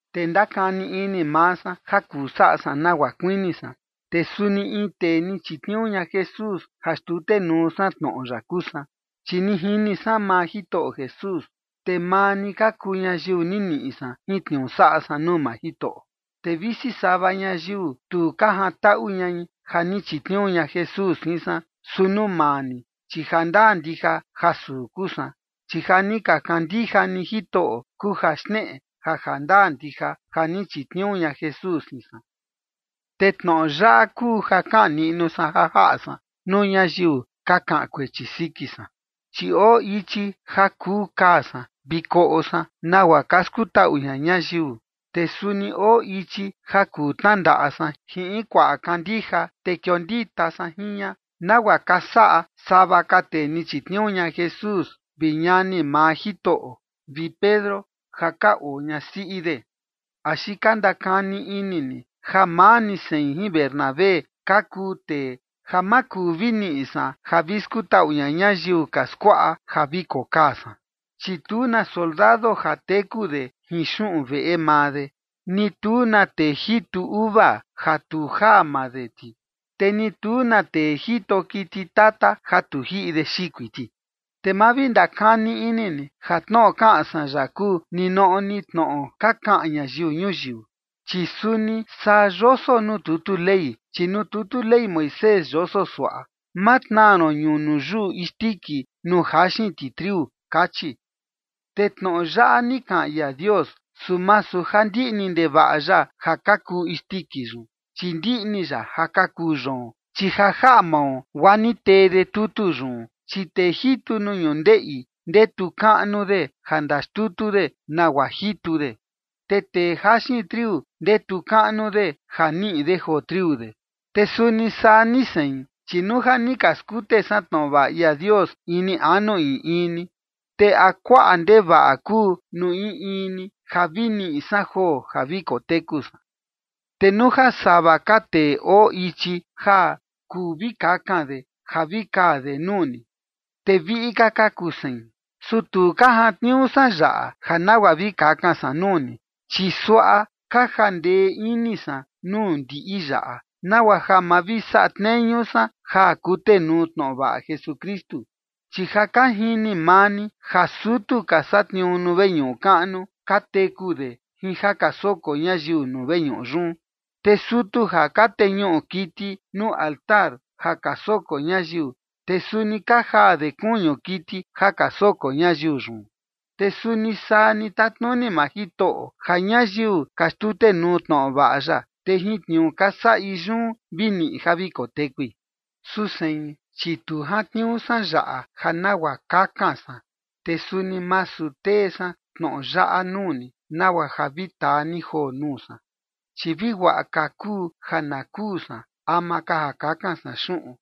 Te ndakani ini maa san ja kuu saꞌa san nagua kuini san. Te suni in tee ni chitniuu ña Jesús ja xtutenuu san tnoꞌo ya kuu san, chi ni jini san maa Jitoꞌo Jesús, te maa ni ka kuu ñayiu ni niꞌi san jin tniuu saꞌa san nuu maa Jitoꞌo. Te visi sava ñayiu tu ka jantaꞌu ñai ja ni chitniuu ña Jesús jin san, su nuu maa ni, chi jandaa ndija ja suu kuu san, chi ja ni ka kandija ni Jitoꞌo kuu ja xneꞌe ja jandaa ndija ja ni chitniuu ña Jesús jin san. Te tnoꞌo yaꞌa kuu ja kaꞌan niꞌnu san ja jaꞌa san nuu ñayiu ka kaꞌan kuechi siki san, chi oo ichi ja kuu kaa san vi koꞌo san nagua ka skutaꞌu ña ñayiu. Te suni oo ichi ja kuu tnandaꞌa san jin in kuaꞌa kandija, te kiondita san jin ña, nagua ka saꞌa sava ka tee ni chitniuu ña Jesús vi ñani maa Jitoꞌo vi Pedro, ja ka oo ñasiꞌi de. ¿Axi ka ndakani ini ni ja maa ni sein jin Bernabé ka kuu tee ja ma kuu vi niꞌi san ja vi skutaꞌu ña ñayiu ka skuaꞌa ja vi kokaa san? Chi tu na soldado ja teku de jin xuꞌun veꞌe maa de, ni tu na tee jitu uva ja tu jaa maa de ti, te ni tu na tee jito kiti tata ja tu jiꞌi de xikui ti. Te ma vi ndakani ini ni ja tnoꞌo kaꞌan san yaꞌa, kuu ninoꞌo ni tnoꞌo ka kaꞌan ñayiu ñuyiu, chi suni saa yoso nuu tutu Ley. Chi nuu tutu Ley Moisés yoso suaꞌa: “Ma tnaa ron ñunu yuꞌu isndiki nuu jaxin ti triu”, kachi. Te tnoꞌo yaꞌa ni kaꞌan ia Dios, su masu ja ndiꞌni ndevaꞌa ya ja ka kuu isndiki yun, chi ndiꞌni ya ja ka kuu yoon, chi ja jaꞌa mao guaa ni tee de tutu yun. Chi tee jitu nuu ñundeꞌi ndetu kaꞌnu de ja ndaxtutu de nagua jitu de, te tee jaxin triu ndetu kaꞌnu de ja niꞌi de joo triu de. Te suni saa ni sein, chi nuu ja ni ka skute san tnoꞌo vaꞌa ia Dios ini anu in in ni, ¿te a kuaꞌa ndevaꞌa kuu nuu in in ni ja vi niꞌi san joo ja vi koteku san? Te nuu ja sava ka tee oo ichi ja kuu vi kakan de ja vi kaa de nuu ni, te viꞌi ka ka kuu sein. Su tu ka jantniuu san yaꞌa ja nagua vi kakan san nuu ni, chi suaꞌa ka jandee ini san nuu ndiꞌi yaꞌa, nagua ja ma vi saꞌa tneñu san ja kutenuu tnoꞌo vaꞌa Jesukristu. Chi ja ka jini maa ni ja sutu ka satniuu nuu veñuꞌu kaꞌnu, ka teku de jin ja ka soko ñayiu nuu veñuꞌu yun. Te sutu ja ka teñuꞌu kiti nuu altar ja ka soko ñayiu, te suni ka jaa de kuñu kiti ja ka soko ñayiu yun. Te suni saa ni tatnuni maa Jitoꞌo, ja ñayiu ka xtutenuu tnoꞌo vaꞌa ya, te jin tniuu ja ka saꞌi yun vi niꞌi ja vi kotekui. Su sein, chi tu jantniuu san yaꞌa ja nagua kakan san, te suni masu tee san tnoꞌo yaꞌa nuu ni nagua ja vi taa ni joo nuu san, chi vi guaꞌa ka kuu ja na kuu san ama ka ja kakan san xuꞌun,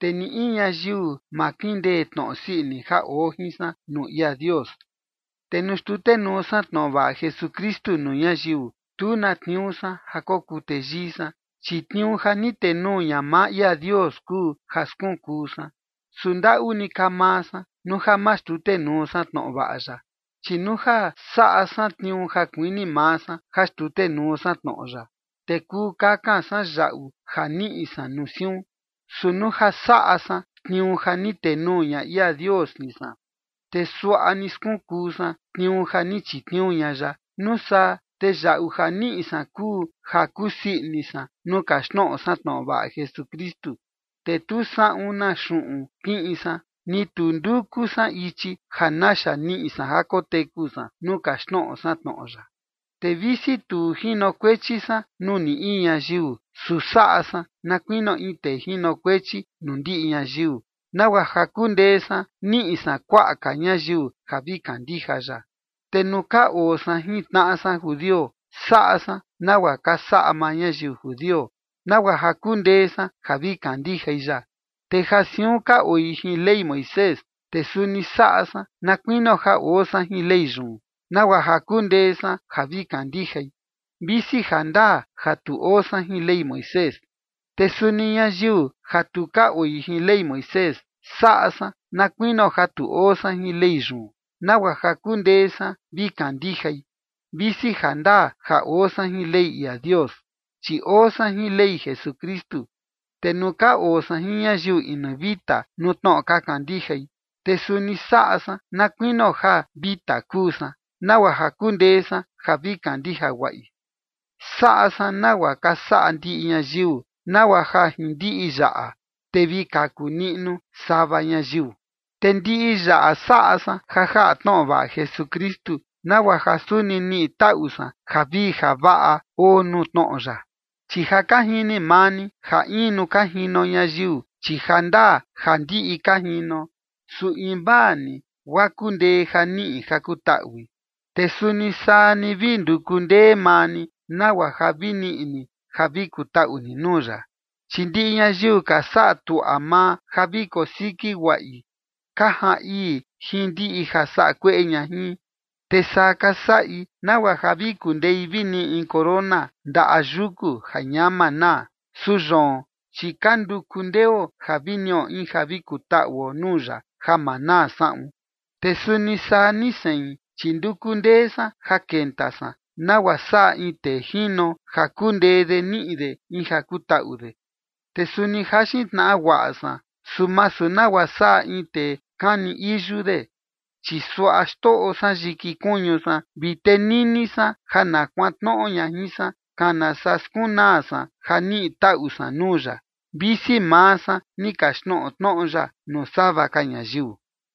te ni in ñayiu ma kindee tnoꞌo sii ini ja oo jin san nuu ia Dios. Te nuu xtutenuu san tnoꞌo vaꞌa Jesukristu nuu ñayiu, tu na tniuu san ja kokuu teyii san, chi tniuu ja ni tenuu ña maa ia Dios kuu ja skunkuu san. Su ndaꞌu ni ka maa san nuu ja ma xtutenuu san tnoꞌo vaꞌa ya. Chi nuu ja saꞌa san tniuu ja kuini maa san ja xtutenuu san tnoꞌo ya, te kuu kakan san yaꞌu ja niꞌi san nuu siun. Su nuu ja saꞌa san tniuu ja ni tenuu ña ia Dios jin san, te suaꞌa ni skunkuu san tniuu ja ni chitniuu ña ya. Nuu saa, te yaꞌu ja niꞌi san kuu ja kusii ini san nuu kaxtnoꞌo san tnoꞌo vaꞌa Jesukristu, te tu saꞌun na xuꞌun kiꞌin san, ni tu nduku san ichi ja naxa niꞌi san ja koteku san nuu kaxtnoꞌo san tnoꞌo ya. Te visi tu jinokuechi san nuu ni in ñayiu, su saꞌa san na kuinio in tee jinokuechi nuu ndiꞌi ñayiu, nagua ja kundee san niꞌi san kuaꞌa ka ñayiu ja vi kandija ya. Te nuu ka oo san jin tnaꞌa san judio, saꞌa san nagua ka saꞌa maa ñayiu judio, nagua ja kundee san ja vi kandijai ya. Te ja siun ka oi jin Ley Moisés, te suni saꞌa san na kuinio ja oo san jin Ley yun, nagua ja kundee san ja vi kandijai, visi jandaa ja tu oo san jin Ley Moisés. Te suni ñayiu ja tu ka oi jin Ley Moisés, saꞌa san na kuinio ja tu oo san jin Ley yun, nagua ja kundee san vi kandijai, visi jandaa ja oo san jin Ley ia Dios, chi oo san jin Ley Jesukristu. Te nuu ka oo san jin ñayiu inu vita nuu tnoꞌo ka kandijai, te suni saꞌa san na kuinio ja vita kuu san, nagua ja kundee san ja vi kandija guaꞌi. Saꞌa san nagua ka saꞌa ndiꞌi ñayiu, nagua ja jin ndiꞌi yaꞌa, te vi kaku niꞌnu sava ñayiu. Te ndiꞌi yaꞌa saꞌa san ja jaꞌa tnoꞌo vaꞌa Jesukristu, nagua ja suni niꞌi taꞌu san javii javaꞌa oo nuu tnoꞌo ya. Chi ja ka jini maa ni ja in nuu ka jino ñayiu, chi jandaa ja ndiꞌi ka jino, su invaa ni guaa kundee ja niꞌi ja kutaꞌui. Te suni saa ni vi nduku ndee maa ni nagua ja vi niꞌi ni ja vi kutaꞌu ni nuu ya. Chi ndiꞌi ñayiu ka saꞌa tuaꞌa maa ja vi kosiki guaꞌi ka jaan ii jin ndiꞌi ja saꞌa kueꞌe ña jin. Te saa ka saꞌi nagua ja vi kundei vi niꞌi in corona ndaꞌa yuku ja ñama naa. Su yoon, chi ka nduku ndeo ja vi niꞌo in ja vi kutaꞌuo nuu ya ja maa naa saꞌun. Te suni saa ni sein, chi nduku ndee san ja kenta san, nagua saꞌa in tee jino ja kundee de niꞌi de in ja kutaꞌu de. Te suni jaxin tnaꞌa guaꞌa san, su masu nagua saꞌa in tee ja kani iyu de. Chi suaꞌa xtoꞌo san yiki kuñu san vi tenini san ja na kuantnoꞌo ña jin san, kana saa skunaa san ja niꞌi taꞌu san nuu ya, visi maa san ni kaxtnoꞌo tnoꞌo ya nuu sava ka ñayiu.